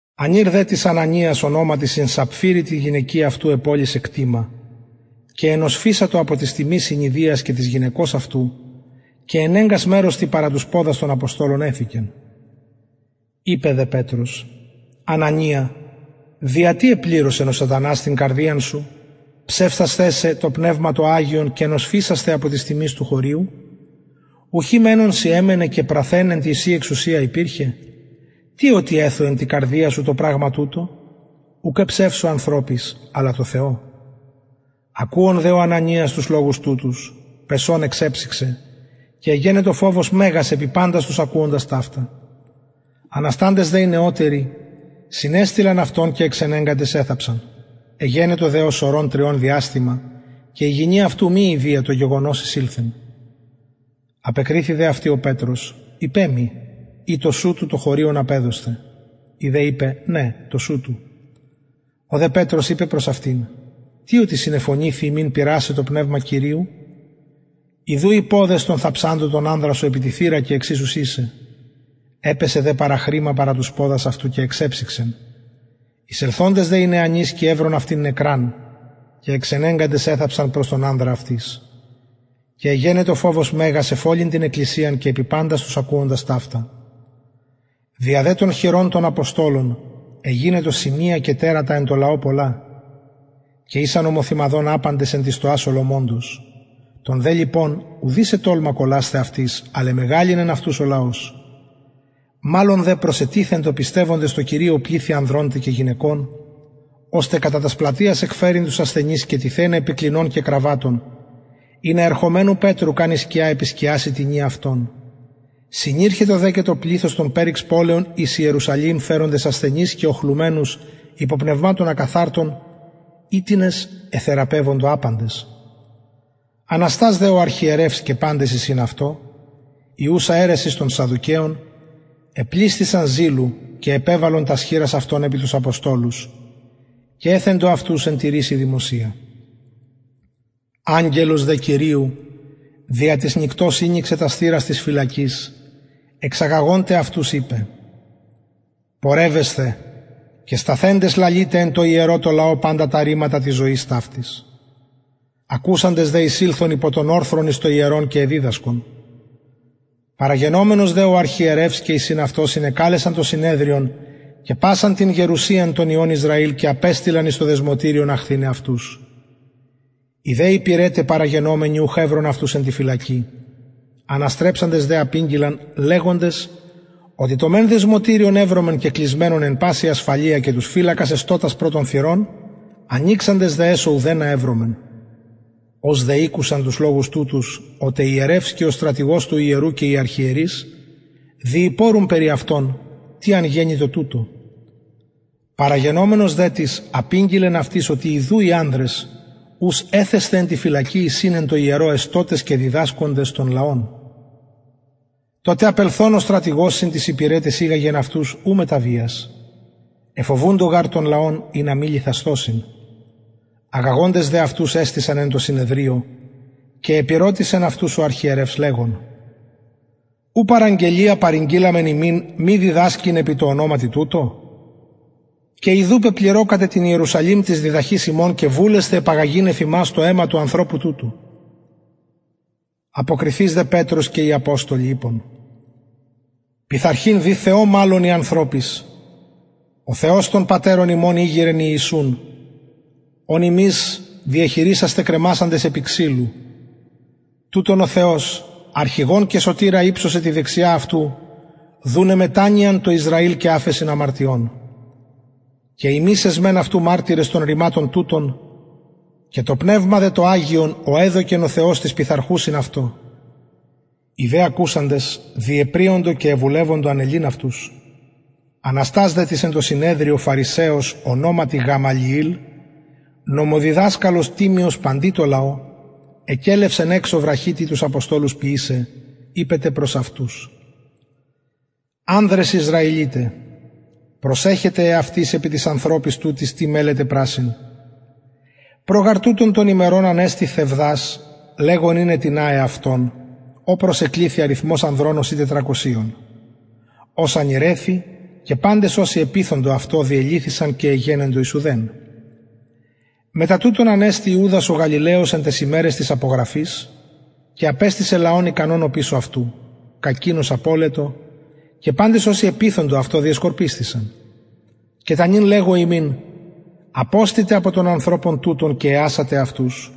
ανηρ δε τις ανανιας ονοματι συν σαπφειρη τη γυναικι αυτου επωλησεν κτημα και ενοσφισατο απο της τιμης συνειδυιας και της γυναικος αυτου και ενεγκας μερος τι παρα τους ποδας των αποστολων εθηκεν ειπεν δε πετρος ανανια δια τι επληρωσεν ο σατανας την καρδιαν σου ψευσασθαι σε το πνευμα το αγιον και νοσφισασθαι σε απο της τιμης του χωριου ουχι μενον σοι εμενεν και πραθεν εν τη ση εξουσια υπηρχεν τι οτι εθου εν τη καρδια σου το πραγμα τουτο ουκ εψευσω ανθρωποις αλλα τω θεω ακουων δε ο ανανιας τους λογους τουτους πεσων εξεψυξεν και εγενετο φοβος μεγας επι παντας τους ακουοντας ταυτα ανασταντες δε οι νεωτεροι συνεστειλαν αυτον και εξενεγκαντες εθαψαν εγενετο δε ως ωρων τριων διαστημα και η γυνη αυτου μη ειδυια το γεγονος εισηλθεν απεκριθη δε αυτη ο πετρος ειπε μοι ει τοσουτου το χωριον απεδοσθε η δε ειπεν ναι τοσουτου ο δε πετρος ειπεν προς αυτην τι οτι συνεφωνηθη υμιν πειρασαι το πνευμα κυριου ιδου οι ποδες των θαψαντων τον ανδρα σου επι τη θυρα και εξοισουσιν σε επεσεν δε παραχρημα παρα τους ποδας αυτου και εξεψυξεν εισελθοντες δε οι νεανισκοι ευρον αυτην νεκραν και εξενεγκαντες εθαψαν προς τον ανδρα αυτης και εγενετο φοβος μεγας εφ ολην την εκκλησιαν και επι παντας τους ακουοντας ταυτα δια δε των χειρων των αποστολων εγινετο σημεια και τερατα εν τω λαω πολλα και ησαν ομοθυμαδον απαντες εν τη στοα σολομωντος των δε λοιπων ουδεις ετολμα κολλασθαι αυτοις αλλ εμεγαλυνεν αυτους ο λαος μαλλον δε προσετιθεντο πιστευοντες τω κυριω πληθη ανδρων τε και γυναικων ωστε κατα τας πλατειας εκφερειν τους ασθενεις και τιθεναι επι κλινων και κραββατων ινα ερχομενου πετρου καν η σκια επισκιαση τινι αυτων συνηρχετο δε και το πληθος των περιξ πολεων εις ιερουσαλημ φεροντες ασθενεις και οχλουμενους υπο πνευματων ακαθαρτων οιτινες εθεραπευοντο απαντες αναστας δε ο αρχιερευς και παντες οι συν αυτω η ουσα αιρεσις των σαδδουκαιων επλησθησαν ζηλου και επεβαλον τας χειρας αυτων επι τους αποστολους και εθεντο αυτους εν τηρησει δημοσια αγγελος δε κυριου δια της νυκτος ηνοιξεν τας θυρας της φυλακης εξαγαγων τε αυτους ειπεν πορευεσθε και σταθεντες λαλειτε εν τω ιερω τω λαω παντα τα ρηματα της ζωης ταυτης ακουσαντες δε εισηλθον υπο τον ορθρον εις το ιερον και εδιδασκον παραγενομενος δε ο αρχιερευς και οι συν αυτω συνεκαλεσαν το συνεδριον και πασαν την γερουσιαν των υιων ισραηλ και απεστειλαν εις το δεσμωτηριον αχθηναι αυτους οι δε υπηρεται παραγενομενοι ουχ ευρον αυτους εν τη φυλακη αναστρεψαντες δε απηγγειλαν λεγοντες οτι το μεν δεσμωτηριον ευρομεν κεκλεισμενον εν παση ασφαλεια και τους φυλακας εστωτας προ των θυρων ανοιξαντες δε εσω ουδενα ευρομεν ως δε ηκουσαν τους λογους τουτους ο τε ιερευς και ο στρατηγος του ιερου και οι αρχιερεις διηπορουν περι αυτων τι αν γενοιτο τουτο παραγενομενος δε τις απηγγειλεν αυτοις οτι ιδου οι ανδρες ους εθεσθε εν τη φυλακη εισιν εν τω ιερω εστωτες και διδασκοντες τον λαον τοτε απελθων ο στρατηγος συν τοις υπηρεταις ηγαγεν αυτους ου μετα βιας εφοβουντο γαρ τον λαον ινα μη λιθασθωσιν αγαγοντες δε αυτους εστησαν εν τω συνεδριω και επηρωτησεν αυτους ο αρχιερευς λεγων ου παραγγελια παρηγγειλαμεν υμιν μη διδασκειν επι τω ονοματι τουτω και ιδου πεπληρωκατε την ιερουσαλημ της διδαχης υμων και βουλεσθε επαγαγειν εφ ημας το αιμα του ανθρωπου τουτου αποκριθεις δε πετρος και οι αποστολοι ειπον πειθαρχειν δει θεω μαλλον η ανθρωποις ο θεος των πατερων ημων ηγειρεν ιησουν ον υμεις διεχειρισασθε κρεμασαντες επι ξυλου τουτον ο θεος αρχηγον και σωτηρα υψωσεν τη δεξια αυτου δουναι μετανοιαν τω ισραηλ και αφεσιν αμαρτιων και ημεις εσμεν αυτου μαρτυρες των ρηματων τουτων και το πνευμα δε το αγιον ο εδωκεν ο θεος τοις πειθαρχουσιν αυτω οι δε ακουοντες διεπριοντο και εβουλευοντο ανελειν αυτους αναστας δε τις εν τω συνεδριω φαρισαιος ονοματι γαμαλιηλ νομοδιδασκαλος τιμιος παντι τω λαω εκελευσεν εξω βραχυ τι τους αποστολους ποιησαι ειπεν τε προς αυτους ανδρες ισραηλιται προσεχετε εαυτοις επι τοις ανθρωποις τουτοις τι μελλετε πρασσειν προ γαρ τουτων των ημερων ανεστη θευδας λεγων ειναι τινα εαυτον ω προσεκληθη αριθμος ανδρων ωσει τετρακοσιων ος ανηρεθη και παντες οσοι επειθοντο αυτω διελυθησαν και εγενοντο εις ουδεν μετα τουτον ανεστη ιουδας ο γαλιλαιος εν ταις ημεραις της απογραφης και απεστησεν λαον ικανον οπισω αυτου κακεινος απωλετο και παντες οσοι επειθοντο αυτω διεσκορπισθησαν και τα νυν λεγω υμιν αποστητε απο των ανθρωπων τουτων και εασατε αυτους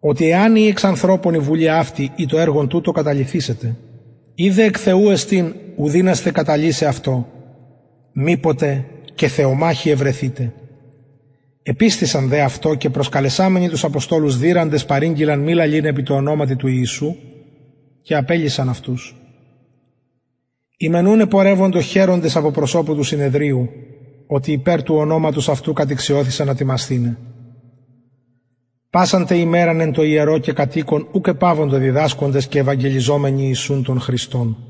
οτι εαν η εξ ανθρωπων η βουλη η το εργον τουτο καταλυθησεται ει δε εκ θεου εστιν ου δυνασθε καταλυσαι αυτο μηποτε και θεομαχοι ευρεθητε επεισθησαν δε αυτω και προσκαλεσαμενοι τους αποστολους δειραντες παρηγγειλαν μη λαλειν επι τω ονοματι του ιησου και απελυσαν αυτους οι μεν ουν επορευοντο χαιροντες απο προσωπου του συνεδριου οτι υπερ του ονοματος του ιησου κατηξιωθησαν ατιμασθηναι πασαν τε ημεραν εν τω ιερω και κατ οικον ουκ επαυοντο διδασκοντες και ευαγγελιζομενοι ιησουν τον χριστον